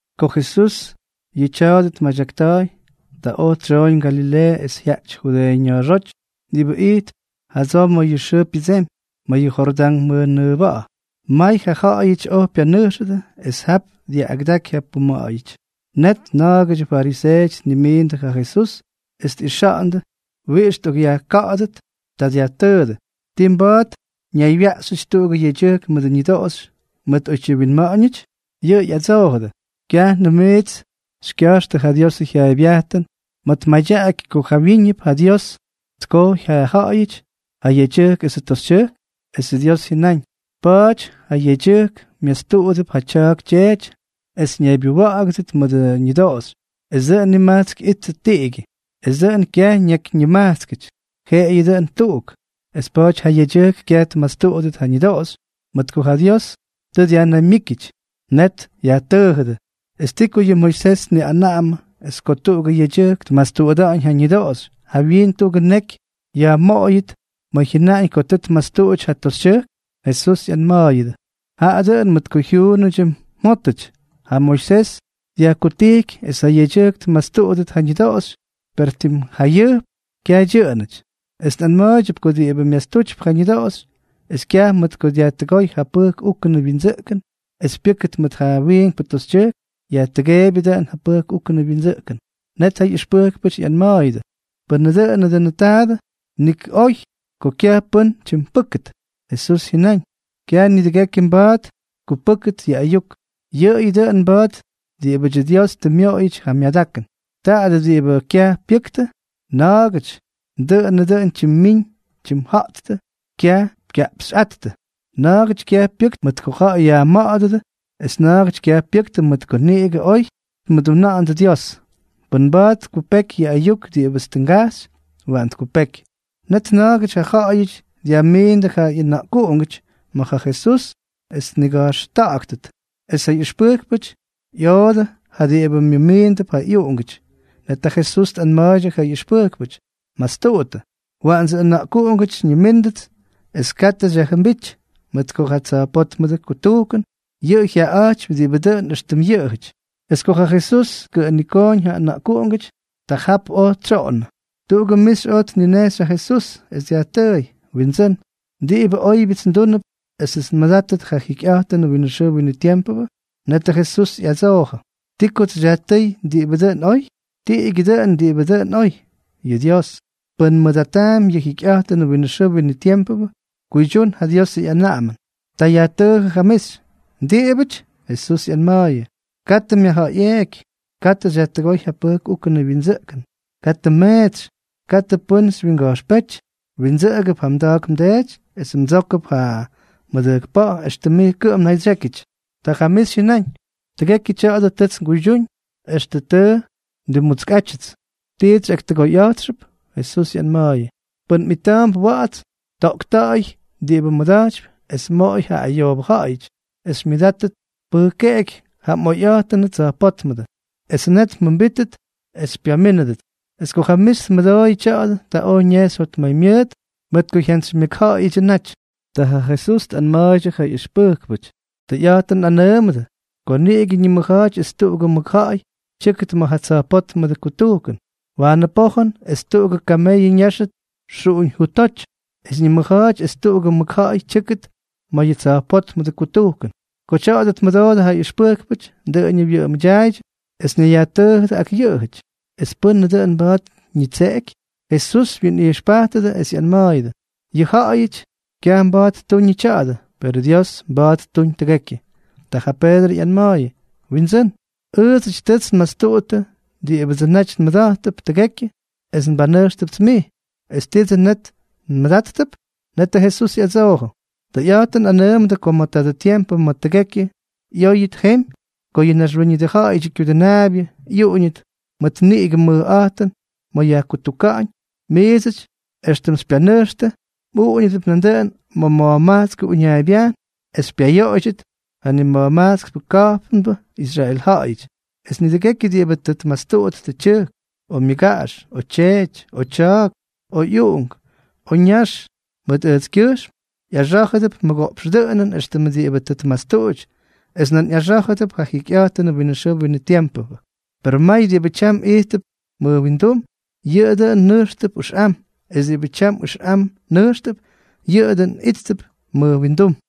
Ko Jesús yʉ tya̱a̱dʉ tmadyakta̱a̱y, ta oj tsyooñ Galileeʉ es jyajty Judeeʉ ña̱a̱xóty diꞌibʉ ijtp jadsoo ma̱ yʉ xʉʉ pyʉdsemy, ma̱ yʉ Jordán mʉjnʉʉba̱ꞌa̱. May ja ja̱ꞌa̱yʉty oj pyanʉjxʉdʉ, es jap dyaꞌꞌagʉdaky ja puma̱ꞌa̱yʉty. Net na̱a̱gʉdyʉ fariseeʉty tnimiindʉ ja Jesús es tꞌixa̱ꞌa̱ndʉ wiꞌix tꞌokꞌyajka̱ꞌa̱dʉt. Ta dyajtʉʉdʉ: —¿Ti mba̱a̱t ñaywyaꞌxyʉty tuꞌugʉ yedyʉjk mʉdʉ ñʉdoꞌoxy mʉt oytyi winma̱ꞌa̱ñʉty? Yʉꞌʉ ꞌyadsoojʉdʉ: —¿Kyajnʉm miits xykya̱jxtʉ ja Diosʉ jyaaybyajtʉn ma̱ tmadyaꞌaky ko jawyíñʉp ja Dios tkojy ja ja̱ꞌa̱yʉty, ja yedyʉjk esʉ toxytyʉjk?, esʉ Dios jyʉnáñ: “Pa̱a̱ty ja yedyʉjk myastuꞌudʉp ja tya̱a̱k tyeety es ñaybyʉwa̱ꞌa̱gʉdʉt mʉdʉ ñʉdoꞌoxy, es dʉꞌʉn nimajtsk ꞌyíttʉt tiꞌigyʉ.” Es dʉꞌʉn kyaj ñakyñimajtskʉty, jeꞌeyʉ dʉꞌʉn tuꞌuk. Es pa̱a̱ty ja yedyʉjk kyaj tmastuꞌudʉt ja ñʉdoꞌoxy, mʉt ko ja Dios tʉ yajnaymyíkyʉty. Net yajtʉʉjʉdʉ: —¿Es ti ko yʉ Moisés tniꞌanaꞌamʉ es ko tuꞌugʉ yedyʉjk tmastuꞌuta̱ꞌa̱ñ ja ñʉdoꞌoxy, jawyiin tuꞌugʉ neky yajmoꞌot ma̱ jyʉnaꞌañ ko tʉ tmastuꞌuty ja toxytyʉjk? Jesús ꞌyanma̱a̱yʉdʉ: —Jaꞌa dʉꞌʉn mʉt ko jyuunʉdyʉ mjótʉty ja Moisés dyajkutijky es ja yedyʉjk tmastuꞌudʉt ja ñʉdoꞌoxy, per tim jayʉjp kyaj dyʉꞌʉnʉty. Es nꞌanma̱a̱ydyʉp ko diꞌibʉ myastutypy ja ñʉdoꞌoxy, es kyaj mʉt ko dyajtʉgooy ja pʉjk úkʉnʉ wyindsʉꞌkʉn, es pyʉ́kʉt mʉt ja wiinkpʉ toxytyʉjk, yajtʉgeebyʉ dʉꞌʉn ja pʉjk úkʉnʉ wyindsʉꞌkʉn. Net ja ꞌyʉxpʉjkpʉty ꞌyanma̱a̱yʉdʉ: —Pʉnʉ dʉꞌʉnʉ dʉꞌʉnʉ taadʉ, nik oy ko kyaj pʉ́n tyimpʉ́kʉt. Jesús jyʉnáñ: —Kyaj nidʉgekyʉ mba̱a̱t tkupʉ́kʉt yʉ ayuk, yʉꞌʉyʉ dʉꞌʉn mba̱a̱t diꞌibʉdyʉ Dios tʉ myoꞌoyʉty ja myadakʉn. Ta diꞌibʉ kyaj pyʉktʉ. Na̱a̱gʉty dʉꞌʉnʉ dʉn tyimmín tyimja̱ꞌttʉ kyaj kyaꞌpxꞌáttʉ, na̱a̱gʉty kyaj pyʉktʉ mʉt ko ja̱ꞌa̱y yajma̱ꞌa̱dʉdʉ, es na̱a̱gʉty kyaj pyʉktʉ mʉt ko niꞌigʉ oy tmʉduna̱ꞌa̱ndʉ Dios. Pʉ́n mba̱a̱t tkupeky yʉ ayuk diꞌibʉts tʉ ngajxy, waꞌan tkupeky. Net na̱a̱gʉty ja ja̱ꞌa̱yʉty dyajmiindʉ ja ꞌyʉna̱ꞌkuꞌungʉty ma̱ ja Jesús es tniga̱jxta̱ꞌa̱ktʉt; es ja ꞌyʉxpʉjkpʉty ꞌyoodʉ ja diꞌibʉ myʉmiindʉp ja ꞌyʉna̱ꞌkuꞌungʉty. Net ja Jesús tꞌanma̱a̱ydyʉ ja ꞌyʉxpʉjkpʉty: —Mastuꞌuttʉ, waꞌandsʉ ʉna̱ꞌkuꞌungʉty xyñimíndʉts, es katʉ xyajjʉmbíty, mʉt ko ja tsa̱jpótmʉdʉ kutujkʉn yʉꞌʉ jyaꞌaꞌa̱jtypy diꞌibʉ dʉꞌʉn éxtʉm yʉꞌʉjʉty. Es ko ja Jesús tkʉꞌʉnikooñ ja ʉna̱ꞌkuꞌungʉty, ta jap oj tsyoꞌonnʉ. Tuꞌugʉ mixy oj tninejxy ja Jesús, es dyajtʉʉy: —Windsʉ́n, ¿diꞌibʉ óybyʉts ndúnʉp esʉts nmʉdátʉt ja jikyꞌa̱jtʉnʉ winʉ xʉʉ winʉ tiempʉ? Netʉ Jesús ꞌyadsoojʉ: —¿Ti kots xyajtʉ́y diꞌibʉ dʉn oy? Tiꞌigyʉ dʉꞌʉn diꞌibʉ dʉn oy, yʉ Dios. Pʉn mmʉdataampy yʉ jikyꞌa̱jtʉnʉ winʉ xʉʉ winʉ tiempʉ, kuydyún ja Diosʉ ꞌyanaꞌamʉn. Ta yajtʉʉjʉ ja mixy: —¿Diꞌibʉty? Jesús ꞌyanma̱a̱yʉ: —Katʉ myajja̱ꞌa̱yꞌeeky, katʉ xyajtʉgóy ja pʉjk úkʉnʉ wyindsʉꞌkʉn, katʉ mmeetsy, katʉ pʉ́n xywyinga̱jxpéty, mwindsʉꞌʉgʉp ja mda̱a̱k mdeety es mdsókʉp ja mmʉdʉjkpa̱ꞌa̱ éxtʉm mij kʉꞌʉm mnaydsyékyʉty. Ta ja mixy jyʉnáñ: —Tʉgekyʉ tya̱a̱dʉ tʉts nguydyúñ extʉ tʉ ndimmutskꞌátyʉts. ¿Tits xyꞌaktʉgoyꞌa̱jtxʉp? Jesús ꞌyanma̱a̱yʉ: —Pʉn mꞌita̱a̱mp wa̱ꞌa̱ts, toꞌkta̱ꞌa̱y diꞌibʉ mmʉda̱jtypy es moꞌoy ja ayoobʉ ja̱ꞌa̱yʉty, es xymyʉdátʉt pʉjkeꞌeky ja mꞌoyꞌa̱jtʉnʉ tsa̱jpótmʉdʉ. Es net mjʉmbítʉt es xypyamínʉdʉts. Es ko ja mixy tmʉdooyʉ tya̱a̱dʉ, ta oj ñejxy jotmaymyʉʉt, mʉt ko jyantsymyʉkja̱ꞌa̱yʉdyʉ naty. Ta ja Jesús tꞌanma̱a̱ydyʉ ja ꞌyʉxpʉjkpʉty: —Tʉyꞌa̱jtʉn nꞌanʉʉmʉdʉ ko niꞌigʉ ñimʉja̱a̱ty es tuꞌugʉ mʉkja̱ꞌa̱y tyʉ́kʉt ma̱ ja tsa̱jpótmʉdʉ kutujkʉn. Waanʉ pojʉn es tuꞌugʉ kameyʉ ñáxʉt xuꞌuñ jutoty, es ñimʉja̱a̱ty es tuꞌugʉ mʉkja̱ꞌa̱y tyʉ́kʉt ma̱ yʉ tsa̱jpótmʉdʉ kutujkʉn. Ko tya̱a̱dʉ tmʉdoodʉ ja ʉxpʉjkpʉty, dʉꞌʉñʉ wyʉꞌʉmʉdyaaydyʉ es ñayyajtʉʉjʉdʉ ak yʉꞌʉjʉty: —¿Es pʉ́nʉ dʉn mba̱a̱t ñitseꞌeky? Jesús wyinꞌijxpajtʉdʉ es ꞌyanma̱a̱yʉdʉ: —Yʉ ja̱ꞌa̱yʉty kyaj mba̱a̱t ttuñʉ tya̱a̱dʉ, perʉ Dios mba̱a̱t ttuñ tʉgekyʉ. Ta ja Peedrʉ ꞌyanma̱a̱yʉ: —Windsʉ́n, ʉʉdsʉty tʉts nmastuꞌuttʉ diꞌibʉdsʉ naty nmʉda̱jttʉp tʉgekyʉ es nbanʉjxtʉpts mij, ¿es tiidsʉ net nmʉdáttʉp? Netʉ Jesús ꞌyadsoojʉ: —Tʉyꞌa̱jtʉn nꞌanʉʉmʉdʉ ko ma̱ tadʉ tiempʉ ma̱ tʉgekyʉ ꞌyóyʉt jemy, ko yʉ Naxwíñʉdʉ Ja̱ꞌa̱yʉdyʉ Kyudʉnaabyʉ ꞌyuꞌuñʉt mʉt niꞌigʉ mʉjꞌa̱jtʉn ma̱ yajkutuka̱ꞌa̱ñ, miidsʉty éxtʉm xypyanʉjxtʉ mꞌuꞌuñʉdʉp nandʉꞌʉn ma̱ ma̱jmajtskʉ uñaaybyajn es xypyayoꞌoydyʉt ja nima̱jmajtskʉ ka̱jpnbʉ Israel ja̱ꞌa̱yʉty. Es nidʉgekyʉ diꞌibʉ tʉ tmastuꞌuttʉ tyʉjk, o myʉgaꞌax, o tyeety, o tya̱a̱k, o ꞌyuꞌunk, o ñax, mʉt ʉjtskyʉjxm, ꞌyaxá̱jʉdʉp mʉgoꞌpx dʉꞌʉnʉn éxtʉm diꞌibʉ tʉ tmastuꞌuty, es nan ꞌyaxá̱jʉdʉp ja jikyꞌa̱jtʉnʉ winʉ xʉʉ winʉ tiempʉ. Per may diꞌibʉ tyam ijttʉp mʉj windum, yʉꞌʉ dʉn nʉjxtʉp ʉxꞌam; es diꞌibʉ tyam ʉxꞌam nʉjxtʉp, yʉꞌʉ dʉꞌʉn íttʉp mʉj windum.